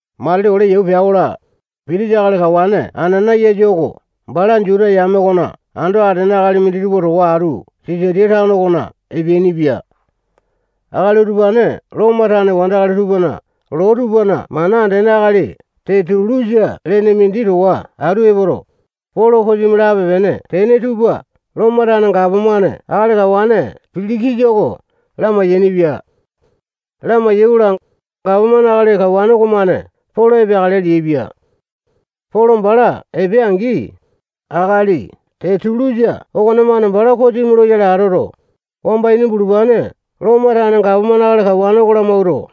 Matili ole yau pea-kola, pitisa akali kawane Anana-yasa oko bala Juta yame okona ando atene akali minditupa towa atu Sisaliya tano okona epeainipia. Akali utupane Lomo tane wandakali tupana loo tupana mana andene akali Tetulusa lene mindi towa atu epoto, Polo kosimi lape-pene tene tupa Lomo tane gapomane akali kawane Pilikisa oko lamai-yainipia. Lamai-yaikola, gapomane akali kawane okomane Polo epeakale leaipia. Polo bala epea-angi, akali Tetulusa okonemane bala kosimi loyale atoto, wamba ini bulupane Lomo tane gapomane akali kawane oko lamawuato,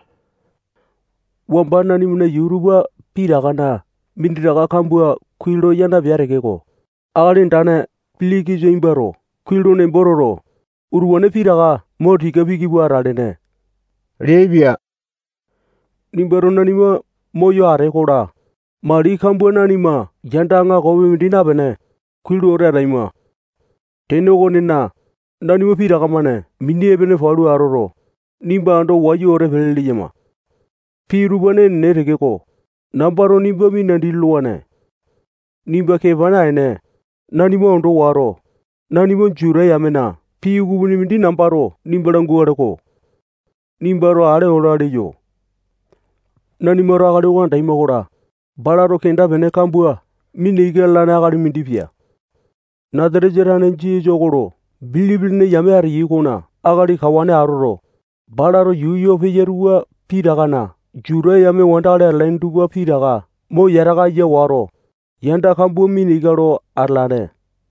wamba nanimana yuu tupa pitakana minditaka kambua kuai lo ya napea tekeko, akali andane Pilikisa nimbato kuai lo nembo toto, utupane pitaka mo tika piki pua atalene leaipia. Nimbato nanima moyo atee-kola, mali kambua nanima yanda aŋakopi mindi napene, kuai lo wete ataima. Tene okonena, nanima pitaka-mane mini epene palu atoto, nimba ando wayu wete pele leyama. Pii utupane enene tekeko, nambato nimba minandi lolowane. Nimba kepa naene, nanima ondo wato, nanima Juta yamena pii ukupini mindi nambato nimba langukale-ko. Nimbato ale ola leyo. Nanimato akali oko andaima-kola, balato kenda-pene kambua mina ika lalane akali mindi pia. Nasatesa tane Jisasa oko lo bilipi lene yame ateyai okona akali kawane atoto, balato yuu yoo peya tupa pitakana Juta yame wandakali atalaini tupa pitaka mo yataka aya wato, yanda kambua mina ika lo atalane.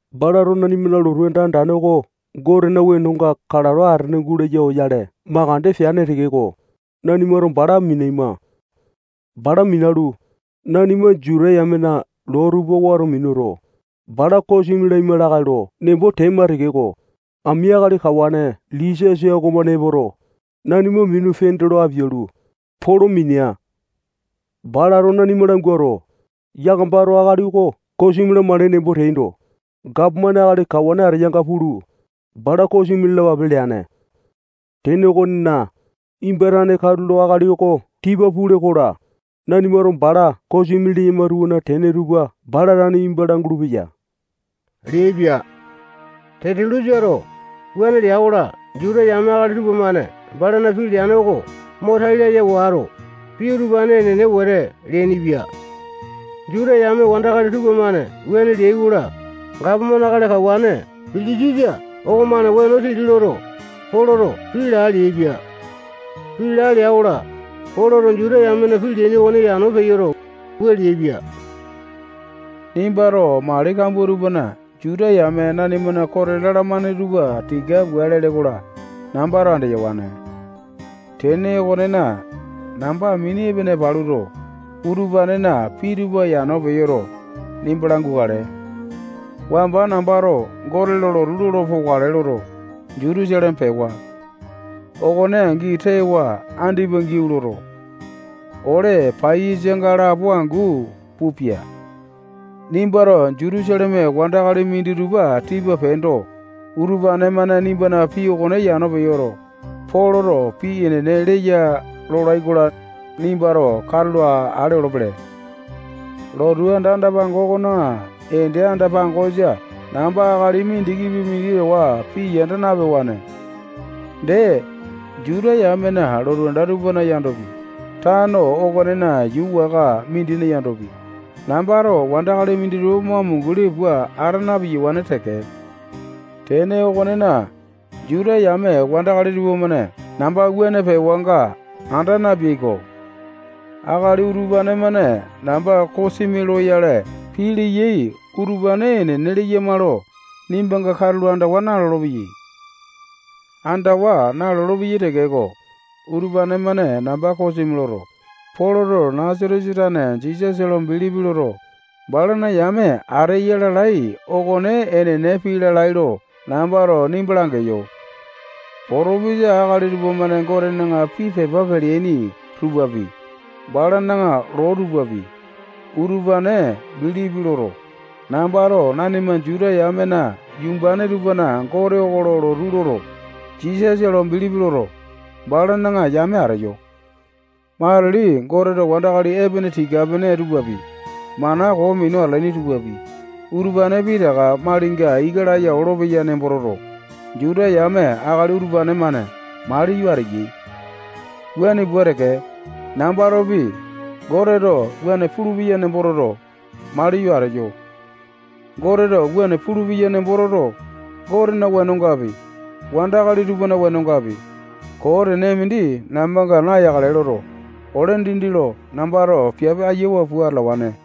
Balato nanimana lotu anda andane oko Gotena wenonga kalato atene gulaya oyale makande peane tekeko, nanimato bala minaima. [Bala minalu, nanima Juta yamena loo tupa wato minuto, bala kosimi laima lakae lo nembo tema tekeko, ami akali kawane Lisiasa okomane epoto, nanima minu pende lo apialu, Polo minia. Balato nanima languato, yakamato akali oko kosimi lamakale nembo teaindo, gapomane akali kawane ateyanga pulu, bala kosimi lalapape leane.] Tene okonena, nimba tane katulo akali oko tipa pule-kola, nanimato bala kosimi leyama tupana tene tupa bala tane nimba langulu-peya leaipia. Tetulu-sato wuane lea-kola, Juta yame akali tupamane balana pii leane oko mo tai laya wato, pii utupane enene wete leainipia. Juta yame wandakali tupamane wuane leai-kola, gapomane akali kawane Pilikisa okomane weno titi loto, Poloto pii laa leaipia. Pii laa lea-kola, Poloto Juta yamena pii leaini okone yano peyoto, wua leaipia: Nimbato mali kambua tupana Juta yame nanimana kote lalamane tupa tika pua lee-kola, nambato andeyawane. Tene okonena, namba mini epene paluto, utupanena pii tupa yano peyoto, nimba langukale. Wamba nambato Gote lo lotu lolo pokale loto, Jutusaleme pewa. Okone angi tewa andipa giau loto, ole paiyasanga lapo angu pupia. Nimbato Jutusaleme wandakali minditupa tipa peendo, utupane-mane nimbana pii okone yano peyoto, Poloto pii enene leya lolai-kola, nimbato katulo ale olopele. Lotu anda andane okona ende anda-pangosa namba akali mindikipi mindi towa pii yanda napewane. Dee, Juta yamena lotu anda tupana yandopi, tano okonena yuu waka mindina yandopi, nambato wandakali minditupa mo amunguli pua ata napewane teke. Tene okonena, Juta yame wandakali tupamane namba wuane pewanga anda napeai-ko. Akali utupane-mane namba kosimi loyale pii leyai utupane enene leyama lo nimbanga katulo andawa nalolo-peyai. Andawa nalolo-peyai tekeko, utupane-mane namba kosimi loto, Poloto Nasatesa tane Jisasa lo bilipi loto, balana yame ateya lalai okone enene pii lalai lo nambato nimba langeyo. Potopesa akali tupamane Gotena pii pepa peleaini tupapi, balana loo tupapi, utupane bilipi loto, nambato nanima Juta yamena yumbane tupana Gote oko lo lotu loto, Jisasa lo bilipi loto, balana yame ateyo. Matili Goteto wandakali epene tika-pene tupapi, mana koo minu atalaini tupapi, utupane pitaka malinga ika laya olopeya nembo toto, Juta yame akali utupane-mane maliyo ateyai. Wuane pua teke, nambatopi, Goteto wuane pulupeya nembo toto, maliyo ateyo. Goteto wuane pulupeya nemboto toto, Gotena wenongapi, wandakali tupana wenongapi, koo tene mindi nambanga nayakale loto, ole dindi lo nambato piape ayawa pua atalawane.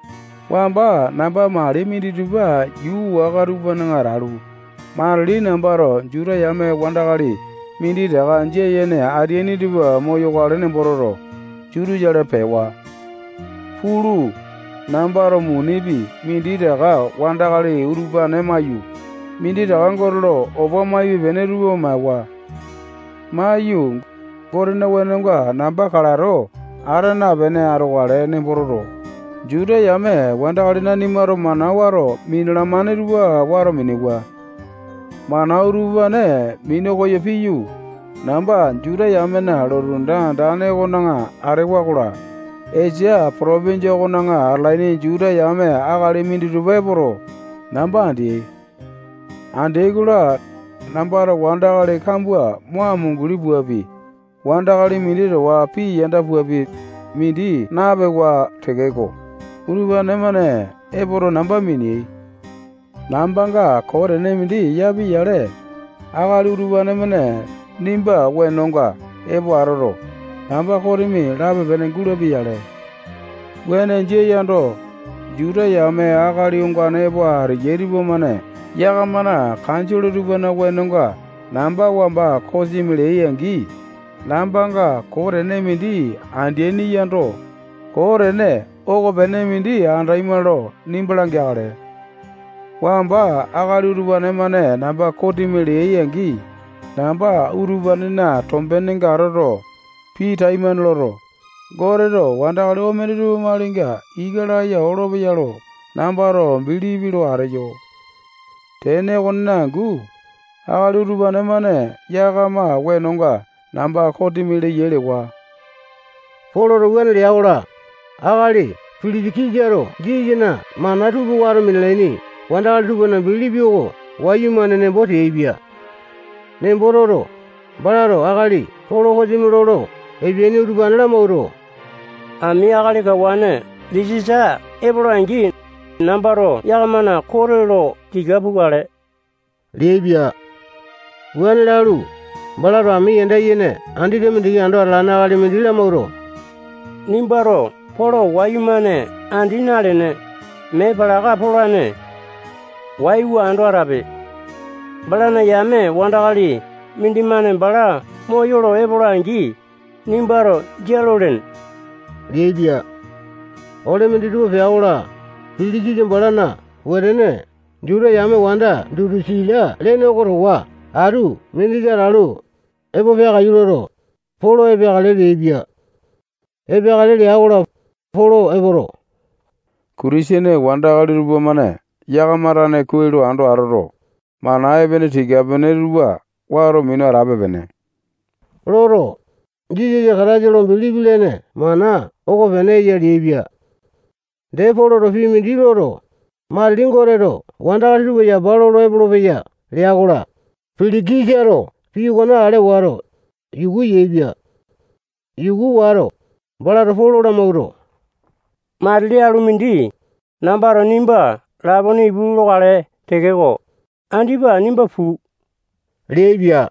Wamba namba mali minditupa yuu waka tupana atalu, matili nambato Juta yame wandakali minditaka jia yene ateaini tupa moyokale nembo toto, Jutusaleme pewa. Pulu, nambato munipi minditaka wandakali utupane maiyu, minditaka Gote lo opa maipe-pene tupa maewa. Maiyu, Gotena wenonga namba kalato ata napene atokale nembo toto, Juta yame wandakali nanimato mana wato minalamane tupa wato minewa. Mana utupane minu koyo piyu, namba Juta yamena lotu anda andane okona atewa-kola, Esia potopinjia okona atalaini Juta yame akali minditupa epoto, namba andeai. Andeai-kola, nambato wandakali kambua mo amunguli puapi, wandakali mindi towa pii yanda puapi, mindi napewa tekeko, utupane-mane epoto, namba miniai. Nambanga koo tene mindi yapia-yale, akali utupane-mane nimba wenonga epo atoto, namba kosimi lape-pene gulapia-yale. Wuane jia yando, Juta yame akali ongane epo ateyai utupa-mane yakamana kanjole tupana wenonga namba wamba kosimi leai-angi, nambanga koo tene mindi andeaini yando, koo tene okopene mindi andema lo nimba langeakale. Wamba akali utupane-mane namba kosimi leai-angi, namba utupanena tombenenga atoto, pii taimane loto, Goteto wandakali omene tupa malinga ika laya olopeya lo nambato bilipi lo ateyo. Tene okonena angu, akali utupane-mane yakama wenonga namba kosimi leyai lewa. Poloto wuane lea-kola, akali Pilikisato Jisasana mana tupa wato minalaini wandakali tupana bilipi oko wayumane nembo teaipia. Nembo toto, balato akali Polo kosimi lolo epeaini utupane lamawuato, ami akali kawane Lisiasa epola-angi, nambato yakamana kote lo tika pukale leaipia. Wuane lalu, balato ami yanda yene andete mindiki ando atalane akali mindi lamawuato, nimbato Polo wayumane andi nalene, mee palaka polane. Waiwa ando atape. Balana yame wandakali mindimane bala moyolo epola-angi, nimbato jia lolene leaipia. Ole minditupa pea-kola, Pilikisa balana wetene Juta yame wanda Dutusila lene oko towa atu mindisa atalu, epo peakaiyu loto, Polo epeakale leaipia. Epeakale lea-kola, Polo epoto, Kitisene wandakali tupamane yakama tane kuai lo ando atoto, mana epene tika-pene tupa wato minu atape-pene loto, Jisasa Kataisa lo bilipi lene mana okopene eya leaipia. Dee, Poloto pii mindi loto, matili Goteto wandakali tupa yapa lolo epolopeya lea-kola, Pilikisato pii okone ale wato, yuku yaepia. Yuku wato, balato Polo lamawuato, matili alu mindi, nambato nimba lapone ipu lokale tekeko, andipa nimba puu leaipia.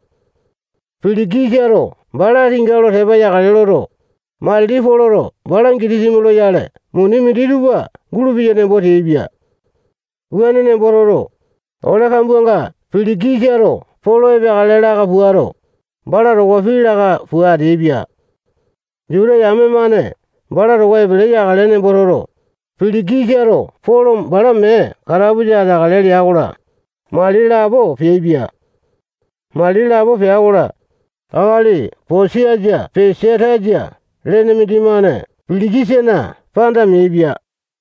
Pilikisato bala tinga lo tepa yakale loto, matili Poloto bala gitisimi loyale muni minditupa gulupeya nembo teaipia. Wuane nembo toto, ole kambuanga Pilikisato Polo epeakale laka puato, bala towa pii laka pua ateaipia. Juta yame-mane bala towa epele yakale nembo toto, Pilikisato Polo bala mee katapusa ateakale lea-kola, mali lapo peaipia. Mali lapo pea-kola, akali Posiasa Pesatasa lene mindimane Pilikisana panda meaipia.